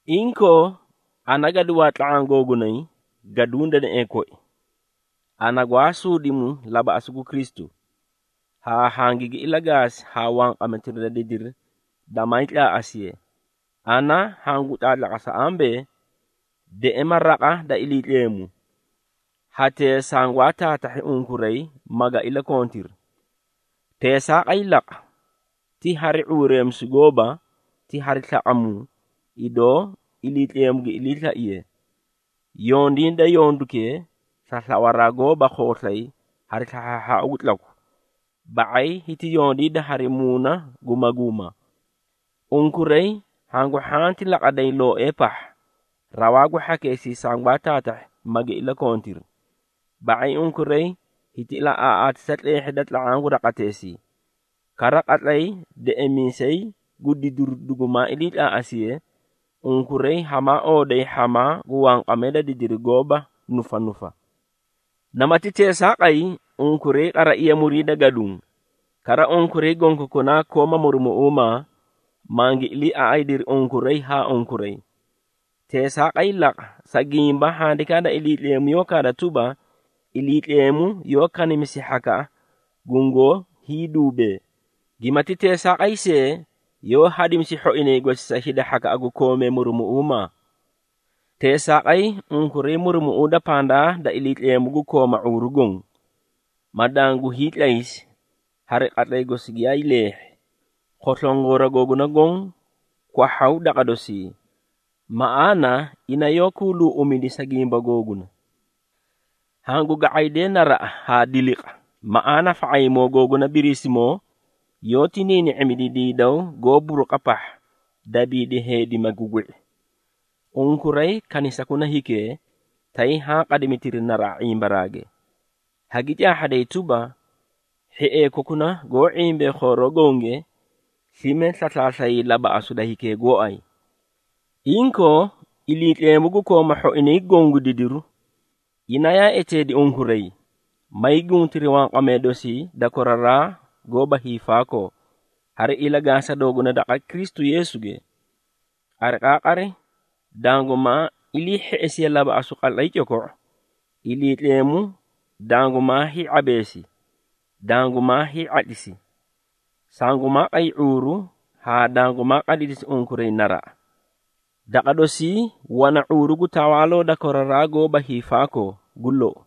Inkoo, ana gaduwaa tla⁄aã googunay gaduũ deneꞌee koi, ana gwaa suudimu labaꞌasu gu Kristu, haa hangigi ilagaasi haa wanqametira da didiri damaay tlaaꞌasiye, ana hangu tlaatlaqasa ambee, deꞌema raqa da Iliitleemu, hatee sangwaa taatahhi unkuray maga iliikontiri. Teesaaqay laqa, ti hari ⁄uureemisu gooba, ti hari slaꞌamuu, idoo Iliitleemu gi iliislaiye. Yondiida yondukee, sa slawaraa gooba khooslay hari slahhaahhaau gu tlaku, ba⁄ay hiti yondiida hari muuna gu maguuma. Unkuray hangu hhanti laqaday looee pahha, rawaa gu hhakeesii sangwaa taatahhi magi iliikontiri. Ba⁄ay unkuray hiti ilaꞌaaꞌaatisa tleehhida daqa raqateesii. Kara qatlay Deꞌemiisay gu Didiru dugumaa iliitlaaꞌasiye, unkuray hamaa ooday hhamaa gu wanqamee da didiri goóba nufanufa. Namati teesaaqay, unkuray qaraiya muriida gaduũ. Kara, unkuray gonkokunaa kooma murumuꞌuumaa, mangi iliiaꞌaydiri unkuray haa unkuray. Teesaaqay laqa, sa gimba Handikaa da Iliitleemu yoó kaada tuba, “Iliitleemu yoó kanimisi hhakaꞌa gungoó hiiduubee, gimati teesaaqay see, yoó hadimisi hhoinay gosi sa hida gu koomee murumuꞌuumaa.” Teesaaqay, unkuray murumuꞌuuda pandaa da Iliitleemu gu kooma ⁄uuru goõ, ma dangu hiitlaysi, hari qatlay gosi giyaay leehhi. Khoslongora googuna goõ kwahhaw daqa dosii, maꞌaana ina yoó kuuluuꞌumidi sa gimba googuna. Hangu ga⁄aydee naraꞌa haa diliqa, maꞌaana fa⁄ayimoo googuna Biriisimoo, yoóti niini⁄imidi diidaw goó buruqa pahha, dabiidi heedi magu gwi⁄i. Unkuray kanisakuna hikee, tay haã qadimitiri naraꞌa ⁄imbaraage, hagi caahhaday tuba, hhiee kokuna goó ⁄imbee khooroo gonge, slime slaslaaslayay labaꞌasu da hikee gooay. Inkoo, Iliitleemu gu koomaa hhoinay goõ gu didiru, ina yaa eteedi unkuray, maay guntiri wanqamee dosii da koraraa goóba hiifaakoo, hari ilagaasa dooguna daqa Kristu Yeesuge. Qariqaaqari dangumaa ilii hheꞌesiye labaꞌasu qatlay coko⁄o, Iliitleemu dangumaa hii⁄abeesi, dangumaa hii⁄atlisi, sangumaa qay ⁄uuru haa dangumaa qadidisi unkuray naraꞌa. Daqa dosii wana ⁄uuru gu tawaaloo da koraraa goóba hiifaakoo. Gu lou.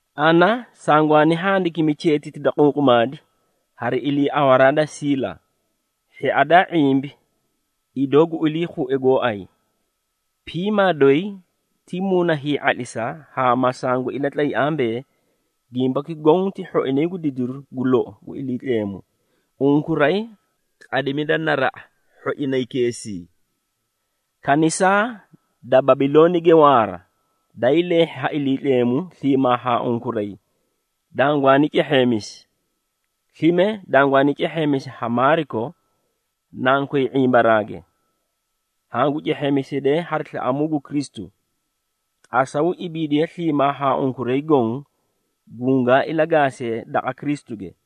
Ana sangwaani handikimi cheetiti da qunqumaadi, hari iliiawaraa da Siila, hhia daa ⁄imbi idoo gu iliikhue gooay. Piimaa doyi ti muuna hii⁄atlisa haa ma sangu ilatlay ambee, gimbaki goõ ti hhoinay gu didiru gu lou gu Iliitleemu. Unkuray qadimida naraꞌa hhoinaykeesii. Kanisaa da Babiloonige waara, daay leehhi ha Iliitleemu sliimaa haa unkuray, dangwaani cehheemisi. Slime dangwaani cehheemisi ha Maariko, nankoy ⁄imbaraage. Hangu cehheemisidee hari slaꞌamuu gu Kristu. Qasaw ibiidiye sliimaa haa unkuray goõ, gungaa ilagaasee daqa Kristuge.